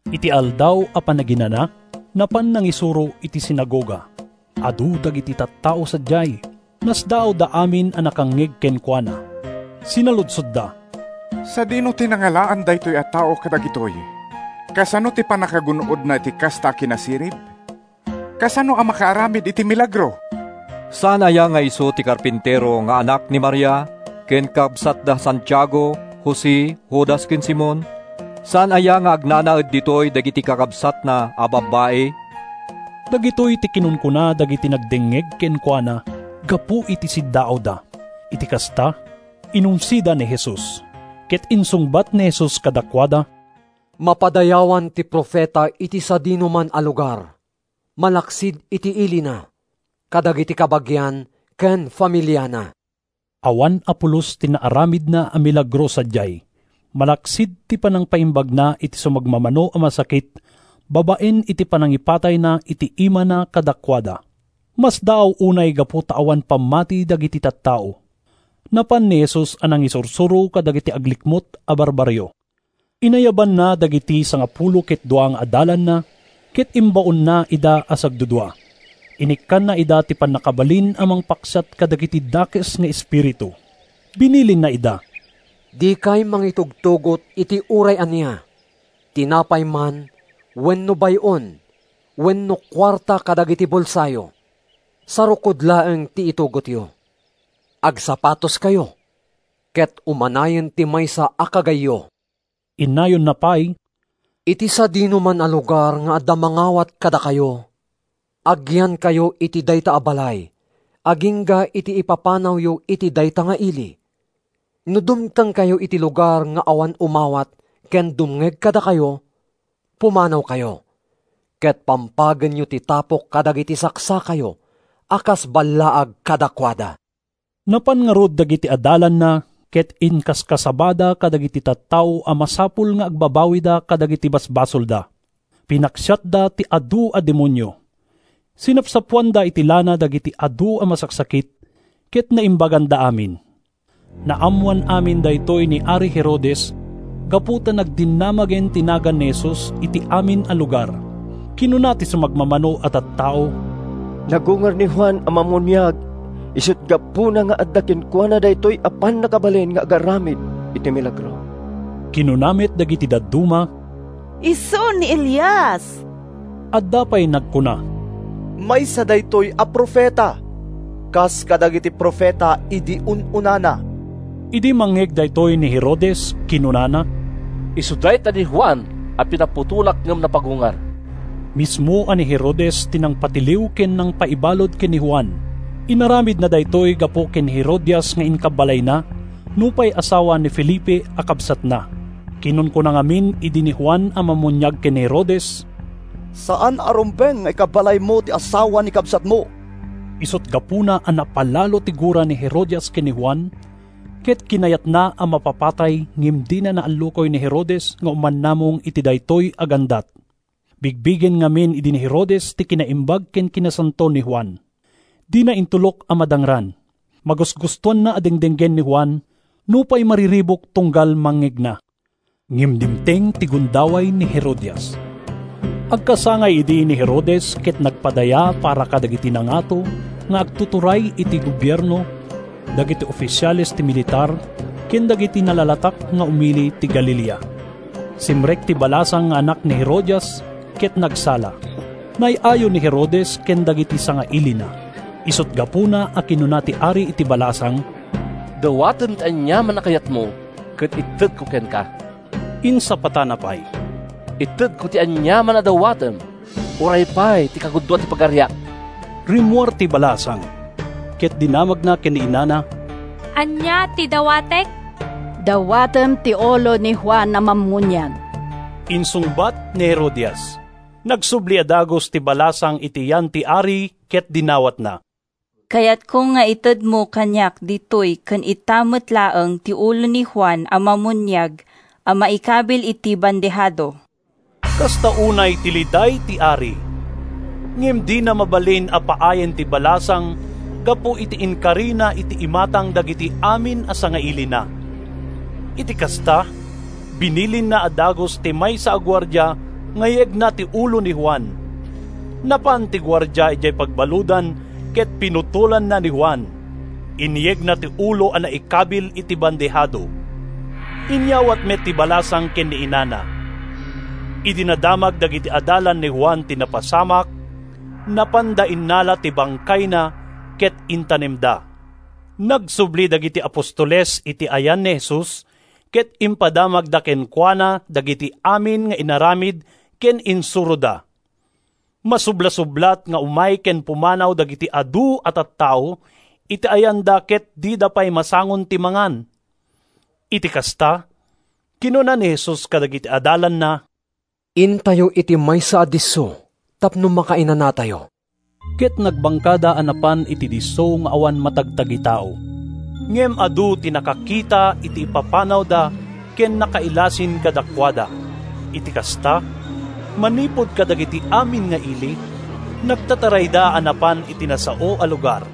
Iti Aldaw a Panaginana, napan nangisuro iti sinagoga. Adu dagiti tattao sadiay. Nasdaawda amin a nakangngeg kenkuana. Sinaludsodda, “Sadino ti nangalaan daytoy a tao kadagitoy? Kasano ti pannakagun-odna iti kasta a kinasirib? Kasano a makaaramid iti milagro? Saan aya nga isu ti karpintero nga anak ni Maria, ken kabsat da Santiago, Jose, Judas ken Simon? Saan aya nga agnanaed ditoy dagiti kakabsatna a babbai?” Dagitoy ti kinunkuna dagiti nagdengngeg kenkuana gapu iti siddaawda. Iti kasta, inumsida ni Jesus. Ket insungbat ni Jesus kadakuada: “Mapadayawan ti profeta iti sadinoman a lugar, malaksid iti ilina, kadagiti kabagian ken familiana.” Awan a pulos ti naaramidna a milagro sadiay, malaksid ti panangpaimbagna iti sumagmamano a masakit babaen iti panangipatayna iti imana kadakuada. Masdaaw unay gapu ta awan pammati dagiti tattao. Napan ni Jesus a nangisursuro kadagiti aglikmut a barbarrio. Inayabanna dagiti sangapulo ket dua nga adalanna, ket imbaonna ida a sagdudua. Inikkanna ida iti pannakabalin a mangpaksiat kadagiti dakes nga espiritu. Binilinna ida, “Dikay mangitugtugot iti uray ania: tinapay man wenno bay-on wenno kuarta kadagiti bulsayo. Sarukod laeng ti itugotyo. Agsapatoskayo, ket umanayen ti maysa a kagayyo.” Innayonna pay, “Iti sadinoman a lugar nga adda mangawat kadakayo, agyankayo iti dayta a balay agingga iti ipapanawyo iti dayta nga ili. No dumtengkayo iti lugar nga awan umawat ken dumngeg kadakayo, pumanawkayo, ket pampagenyo ti tapok kadagiti saksakayo a kas ballaag kadakuada.” Napan ngarud dagiti adalanna ket inkaskasabada kadagiti tattao a masapul nga agbabawida kadagiti basbasolda. Pinaksiatda ti adu a demonio. Sinapsapoanda iti lana dagiti adu a masaksakit ket naimbaganda amin. Naammoan amin dagitoy ni ari Herodes gapu ta nagdinamagen ti nagan ni Jesus iti amin a lugar. Kinuna ti sumagmamano a tattao, “Nagungar ni Juan a Mammuniag! Isut’ gapuna nga adda kenkuana daytoy a pannakabalin nga agaramid iti milagro.” Kinuna met dagiti dadduma, “Isu ni Elias!” Adda pay nagkuna, “Maysa daytoy a profeta, kas kadagiti profeta idi un-unana.” Idi mangngeg daytoy ni Herodes, kinunana, “Isu dayta ni Juan a pinaputolak ngem napagungar!” Mismo a ni Herodes ti nangpatiliw ken nangpaibalud ken ni Juan. Inaramidna daytoy gapu ken ni Herodias nga inkabbalayna, nupay asawa ni Felipe a kabsatna. Kinunkuna ngamin idi ni Juan a Mammuniag ken ni Herodes: “Saan a rumbeng nga ikabbalaymo ti asawa ni kabsatmo!” Isut’ gapuna a napalalo ti gura ni Herodias ken ni Juan, ket kinayatna a mapapatay, ngem dina naallukoy ni Herodes nga umanamong iti daytoy a gandat. Bigbigen ngamin idi ni Herodes ti kinaimbag ken kinasanto ni Juan. Dina intulok a madangran. Magusgustoanna a dengdenggen ni Juan, nupay mariribuk tunggal mangngegna. Ngem dimteng ti gundaway ni Herodias. Agkasangay idi ni Herodes ket nagpadaya para kadagiti nangato nga agtuturay iti gobierno, dagiti ofisiales ti militar ken dagiti nalalatak nga umili ti Galilea. Simrek ti balasang nga anak ni Herodias ket nagsala. Naay-ayo ni Herodes ken dagiti sangailina. Isut’ gapuna a kinuna ti ari iti balasang, “Dawatem ti aniaman a kayatmo, ket itedko kenka!” Insapatana pay, “Itedko ti aniaman a dawatem, uray pay ti kagudua ti pagariak!” Rimmuar ti balasang ket dinamagna ken ni inana, “Ania ti dawatek?” “Dawatem ti ulo ni Juan a Mammuniag!” insungbat ni Herodias. Nagsubli a dagus ti balasang iti yan ti ari ket dinawatna, “Kayatko nga itedmo kaniak ditoy ken ita met laeng ti ulo ni Juan a Mammuniag a maikabil iti bandehado!” Kasta unay ti liday ti ari. Ngem dina mabalin a paayen ti balasang gapu iti inkarina iti imatang dagiti amin a sangailina. Iti kasta, binilinna a dagus ti maysa a guardia nga yegna ti ulo ni Juan. Napan ti guardia idiay pagbaludan ket pinutolanna ni Juan. Inyegna ti ulo a naikabil iti bandehado. Inyawat met ti balasang ken ni inana. Idi nadamag dagiti adalan ni Juan ti napasamak, napanda innala ti bangkayna ket intanemda. Nagsubli dagiti apostoles iti ayan ni Jesus ket impadamagda kenkuana dagiti amin nga inaramid ken insuroda. Masublasublat nga umay ken pumanaw dagiti adu a tattao iti ayanda ket dida pay masangon ti mangan. Iti kasta, kinuna ni Jesus kadagiti adalanna, “Intayo iti maysa a disso tapno makainanatayo.” Ket nagbangkada a napan iti disso nga awan matagtagitao. Ngem adu ti nakakita iti ipapanawda ken nakailasin kadakuada. Iti kasta, manipud kadagiti amin nga ili, nagtatarayda a napan iti nasao a lugar.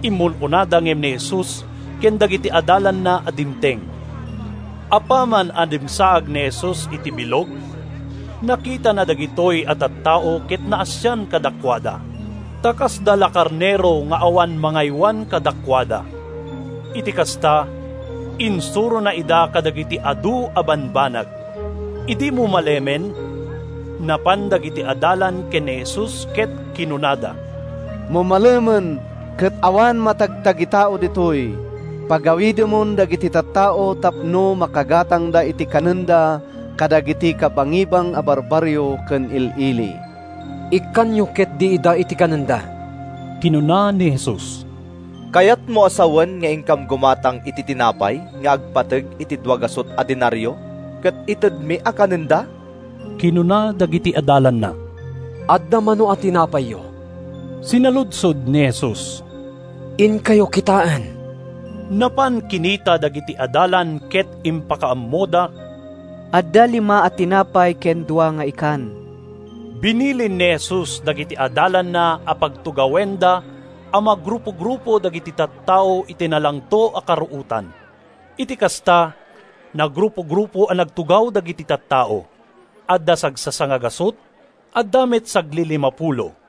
Immun-unada ngem ni Jesus ken dagiti adalanna a dimteng. Apaman a dimsaag ni Jesus iti bilog, nakitana dagitoy a tattao ket naasian kadakuada, ta kasda la karnero nga awan mangaywan kadakuada. Iti kasta, insurona ida kadagiti adu a bambanag. Idi mumalemen, napan dagiti adalan ken ni Jesus ket kinunada, “Mumalemen, ket awan matagtagitao ditoy. Pagawidemon dagiti tattao tapno makagatangda iti kanenda kadagiti kabangibang a barbarrio ken il-ili.” “Ikkanyo ketdi ida iti kanenda,” kinuna ni Jesus. “Kayatmo a sawen nga inkam gumatang iti tinapay nga agpateg iti dua gasut a denario ket itedmi a kanenda?” kinuna dagiti adalanna. “Adda mano a tinapayyo?” sinaludsod ni Jesus. “Inkayo kitaen.” Napan kinita dagiti adalan ket impakaammoda, “Adda lima a tinapay ken dua nga ikan.” Binilin ni Jesus dagiti adalanna a pagtugawenda a magrupo-grupo dagiti tattao iti nalangto a karuotan. Iti kasta, nagrupo-grupo a nagtugaw dagiti tattao: adda sagsasangagasut, adda met saglilimapulo.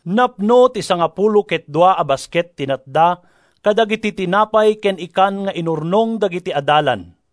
Napno ti sangapulo ket dua a basket ti natda kadagiti tinapay ken ikan nga inurnong dagiti adalan.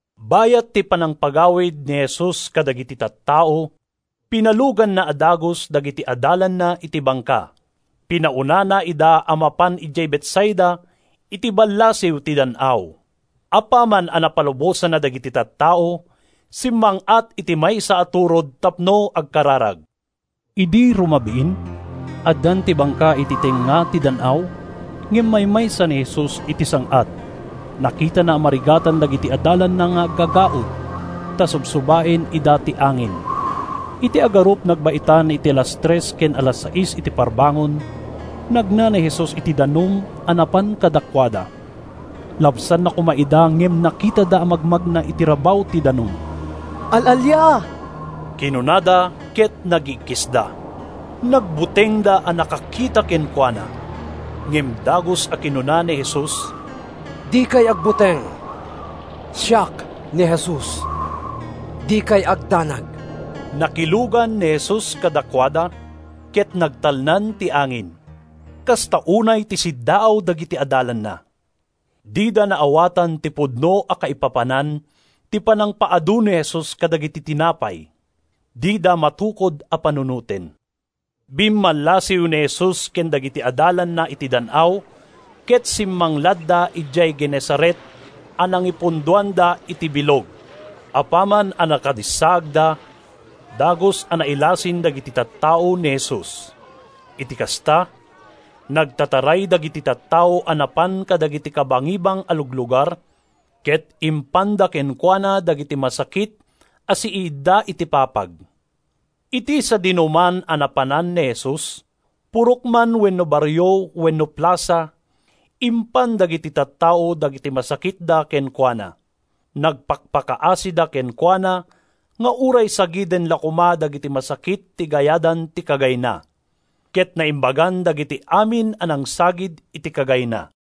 Bayat ti panangpagawid ni Jesus kadagiti tattao, pinaluganna a dagus dagiti adalanna iti bangka. Pinaunana ida a mapan idiay Betsaida, iti ballasiw ti dan-aw. Apaman a napalubosanna dagiti tattao, simmang-at iti maysa a turod tapno agkararag. Idi rumabiin, addan ti bangka iti tengnga ti dan-aw, ngem maymaysa ni Jesus iti sang-at. Nakitana a marigatan dagiti adalanna nga aggagaud, ta subsubaen ida ti angin. Iti agarup nagbaetan iti alas tres ken alas seis iti parbangon, nagna ni Jesus iti danum a napan kadakuada. Labsanna koma ida ngem nakitada a magmagna iti rabaw ti danum. “Al-alia!” kinunada ket naggiikkisda. Nagbutengda a nakakita kenkuana. Ngem dagus a kinuna ni Jesus, “Dikay agbuteng! Siak ni Jesus. Dikay agdanag!” Nakilugan ni Jesus kadakuada, ket nagtalnan ti angin. Kasta unay ti siddaaw dagiti adalanna. Dida naawatan ti pudno a kaipapanan ti panangpaadu ni Jesus kadagiti tinapay. Dida matukod a panunoten. Bimmallasiw ni Jesus ken dagiti adalanna iti dan-aw ket simmangladda idiay Genesaret a nangipundoanda iti bilog. Apaman a nakadissaagda, dagus a nailasin dagiti tattao ni Jesus. Iti kasta, nagtataray dagiti tattao a napan kadagiti kabangibang a luglugar ket impanda kenkuana dagiti masakit a siiidda iti papag. Iti sadinoman a napanan ni Jesus, purok man wenno barrio wenno plasa, impan dagiti tattao dagiti masakitda kenkuana. Nagpakpakaasida kenkuana nga uray sagiden la koma dagiti masakit ti gayadan ti kagayna. Ket naimbagan dagiti amin a nangsagid iti kagayna.